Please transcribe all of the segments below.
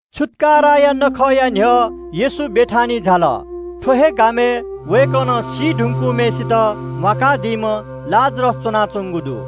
छुत्‍काराया नखःया खुन्‍हु न्‍ह्यः येशू बेथानियाय् झाल। थ्‍व हे गामय् वय्‌कलं सी धुंकूम्‍हय्‌सित म्‍वाकादीम्‍ह लाजरस च्‍वनाच्‍वंगु दु।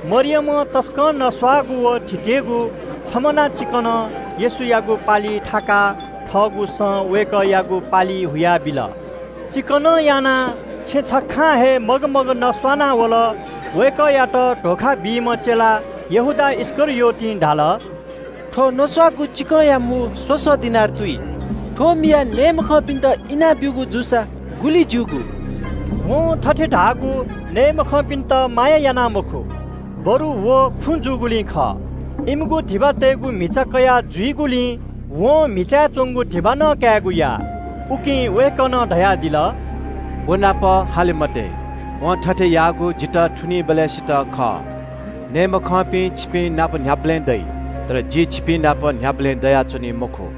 मरियमं तसकं नस्‍वाःगु व थिकेगु जटामसीया बागू लिटर चिकनं येशूयागु पालिइ थाकाः थःगु सं वय्‌कःयागु पालि हुयाबिल। चिकनं यानाः छेँ छखां हे मगमग नस्‍वाः वल। वय्‌कःयात धोखा बीम्‍ह चेला यहूदा इस्‍करियोतं धाल – “थ्‍व नस्‍वाःगु चिकंया मू स्‍वसः दिनार तुइ। थ्‍व मियाः नये मखंपिन्‍त इनाब्‍यूगु जूसा गुलि ज्‍यूगु।” वं थथे धाःगु नये मखंपिन्‍त माया याना मखु, बरु खुँ जूगुलिं खः। धिबाया म्‍हिचा ज्‍वनाजुइम्‍ह जुइगुलिं वं म्‍हिचाय् च्‍वंगु धिबा कायेगु नं याः। उकिं वय्‌कलं धयादिल – “व नाप हाले मते। वं थथे याःगु जितः थुनीबलय्‌सित खः। नये मखंपिं छिपिंनाप न्‍ह्याबलें दइ, तर जि छिपिंनाप न्‍ह्याबलें दयाच्‍वनी मखु।”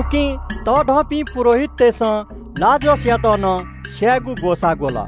उकिं तःधंपिं पुजाहारीतय्‌सं लाजरसयात नं स्‍यायेगु ग्‍वसाः ग्‍वल,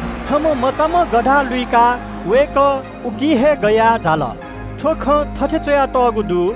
छम्‍ह मचाम्‍ह गधा लुइकाः वय्‌कः उकी हे गयाः झाल। थ्‍व खँ थथे च्‍वयातःगु दु –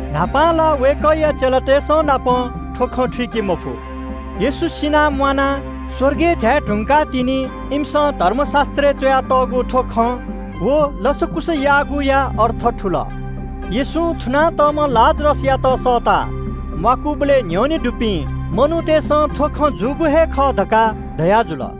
न्‍हापां ला वय्‌कःया चेलातय्‌संनापं थ्‍व खँ थुइके मफु। येशू सिनाः म्‍वानाः स्‍वर्गय् झाये धुंकाः तिनि इमिसं धर्मशास्‍त्रय् च्‍वयातःगु थ्‍व खँ व लसकुस याःगुया अर्थ थुल। येशूं थुना तःम्‍ह लाजरसयात सःताः म्‍वाकादीबलय् न्‍ह्यःने दुपिं मनूतय्‌सं थ्‍व खँ जूगु हे खः धकाः धयाजुल।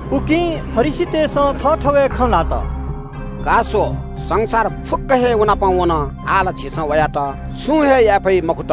उकिं फरिसीतय्‌सं थःथवय् खँ ल्‍हात– “का स्‍व, संसार फुक्‍क हे व नाप वन। आः ला झीसं वयात छुं हे याये फइ मखुत।”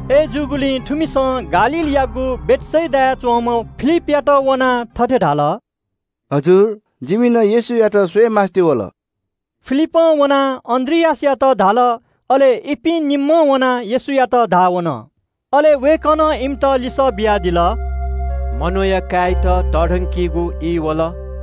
थुपिं ग्रीकतय्‌सं गालीलयागु बेथसेदाय् च्‍वंम्‍ह फिलिपयाथाय् वनाः थथे धाल – “भाजु, जिमि नं येशूयात स्‍वयेमास्‍ति वल।” फिलिपं वनाः अन्‍द्रियासयात धाल। अले इपिं निम्‍हं येशूयात धाः वन। अले वय्‌कलं इमित लिसः बियादिल – “मनूया काय्‌यात तःधंकीगु ई वल।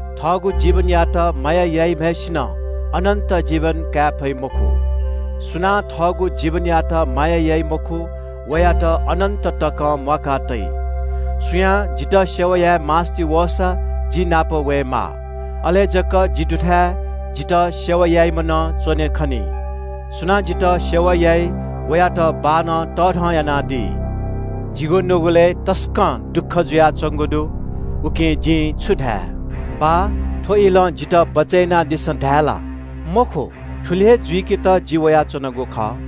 थःगु जीवनयात माया याइम्‍हय्‌सिनं अनन्‍त जीवन काये फइ मखु। सुनां थःगु जीवनयात माया याइ मखु, वयात अनन्‍त तकं म्‍वाका तइ। सुयां जितः सेवा याये मास्‍ति वःसा जि नाप वयेमाः। अले जक जि दुथाय् जितः सेवा याइम्‍ह नं च्‍वने खनी। सुनां जितः सेवा याइ वयात बाःनं तःधं यानादी। “जिगु नुगलय् तसकं दुःख जुयाच्‍वंगु दु। उकिं जिं छु धाये? ‘बाः, थ्‍व इलं जितः बचय् यानादिसँ’ धायेगु ला? मखु, थुलि हे जुइकेत जि वयाच्‍वनागु खः।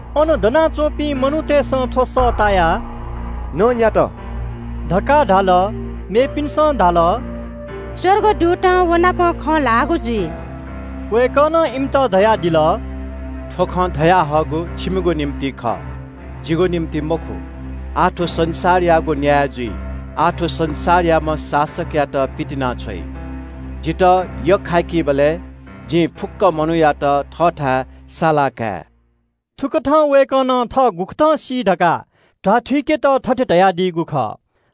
अन दनाच्‍वंपिं मनूतय्‌सं थ्‍व सः तायाः नँ न्‍यात धकाः धाल। मेपिन्‍सं धाल – “स्‍वर्गदूतं व नाप खँ ल्‍हाःगु जुइ।” वय्‌कलं इमित धयादिल – “थ्‍व खँ धयाहःगु छिमिगु निंतिं खः, जिगु निंतिं मखु। आः थ्‍व संसारयागु न्‍याय जुइ। आः थ्‍व संसारयाम्‍ह शासकयात पितिनाछ्वइ। जितः यख्‍खाइबलय् जिं फुक्‍क मनूयात थःथाय् सालाकाये।” थुकथं वय्‌कलं थः गुकथं सी धकाः ध्‍वाथुइकेत थथे धयादीगु खः।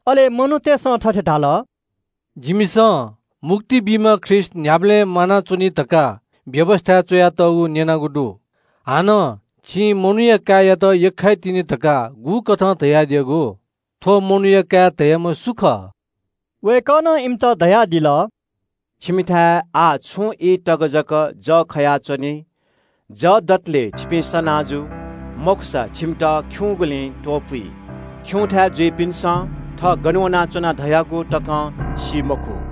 अले यक्‍व मनूतय्‌सं थथे धाल – “जिमिसं मुक्ति बीम्‍ह ख्रीष्‍ट न्‍ह्याबलें म्‍वानाच्‍वनी धकाः व्‍यवस्‍थाय् च्‍वयातःगु न्‍यनागु दु। छिं मनूया काय्‌यात यख्‍खाइ तिनि धकाः गुकथं धयादियागु? थ्‍व मनूया काय् धाःम्‍ह सु खः?” वय्‌कलं इमित धयादिल – “छिकपिन्‍थाय् आः छुं ई तक जक जः खयाच्‍वनी, जः दतले छिकपिं सना जु, मखुसा छिकपिन्‍त खिउँगुलिं त्‍वपुइ। खिउँथाय् जुइपिन्‍सं थः गन वनाच्‍वना धयागु तकं सी मखु।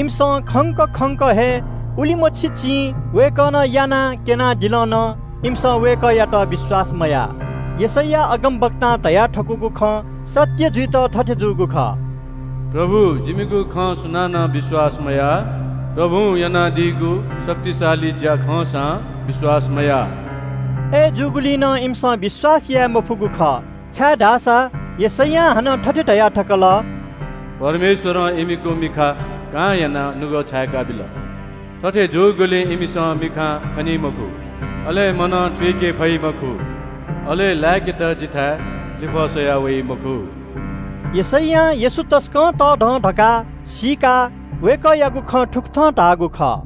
इमिसं खंक खंक हे उलिमछि चिं वय्‌कलं यानाः क्‍यनादिल नं इमिसं वय्‌कःयात विश्‍वास मयाः। यशैया अगमवक्तां धयाथकूगु खँ सत्‍य जुइत थथे जूगु खः – “हे परमप्रभु, जिमिगु खँ सुनानं विश्‍वास मयाः। परमप्रभुं यानादीगु तःधंगु अजू चायापुगु ज्‍या खंसां विश्‍वास मयाः।” अय्‌जूगुलिं नं इमिसं विश्‍वास याये मफुगु खः, छाय्‌धाःसा यशैयां हानं थथे धया थकल – “परमेश्‍वरं इमिगु मिखा कां यानाः नुगः छाय्‌का बिल। थथे जूगुलिं इमिसं मिखां खनी मखु, अले मनं थुइके फइ मखु, अले लाय्‌केत जिथाय् लिफः स्‍वयाः वइ मखु।” यशैयां येशू तसकं तःधं धकाः सीकाः वय्‌कःयागु खँ थुकथं धाःगु खः।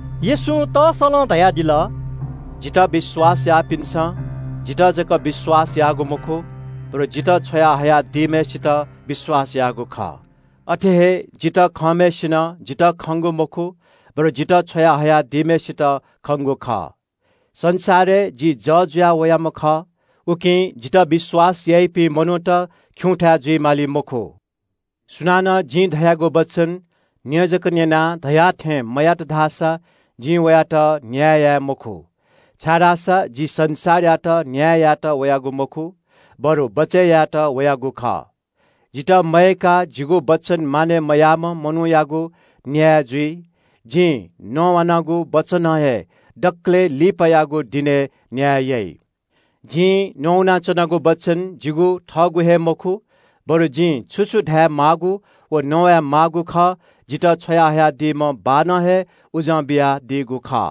येशूं तस्‍सलं धयादिल – “जितः विश्‍वास याःपिन्‍सं जितः जक विश्‍वास याःगु मखु, बरु जितः छ्वया हयादीम्‍हय्‌सित विश्‍वास याःगु खः। अथे हे जितः खंम्‍हय्‌सिनं जितः खंगु मखु, बरु जितः छ्वया हयादीम्‍हय्‌सित खंगु खः। संसारय् जि जः जुया वयाम्‍ह खः, उकिं जितः विश्‍वास याःपिं मनूत खिउँथाय् जुइ माली मखु। सुनानं जिं धयागु वचन न्‍यँ जक न्‍यनाः धया थें मयात धाःसा जिं वयात न्‍याय याये मखु, छाय्‌धाःसा जि संसारयात न्‍याय यायेत वयागु मखु, बरु बचय् यायेत वयागु खः। जितः मयय्‌काः जिगु वचन मानय् मयाइम्‍ह मनूयागु न्‍याय जुइ। जिं नवानागु वचनं हे दकलय् लिपायागु दिनय् न्‍याय याइ। जिं नवानाच्‍वनागु वचन जिगु थःगु हे मखु, बरु जिं छु छु धायेमाःगु व नवाये माःगु खः जितः छ्वयाहयादीम्‍ह बाःनं हे उजं बियादीगु खः।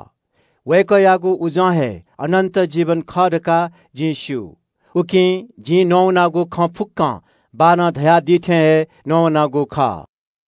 वय्‌कःयागु उजं हे अनन्‍त जीवन खः धकाः जिं स्‍यू, उकिं जिं नवानागु खँ फुक्‍कं बाःनं धयादी थें हे नवानागु खः।”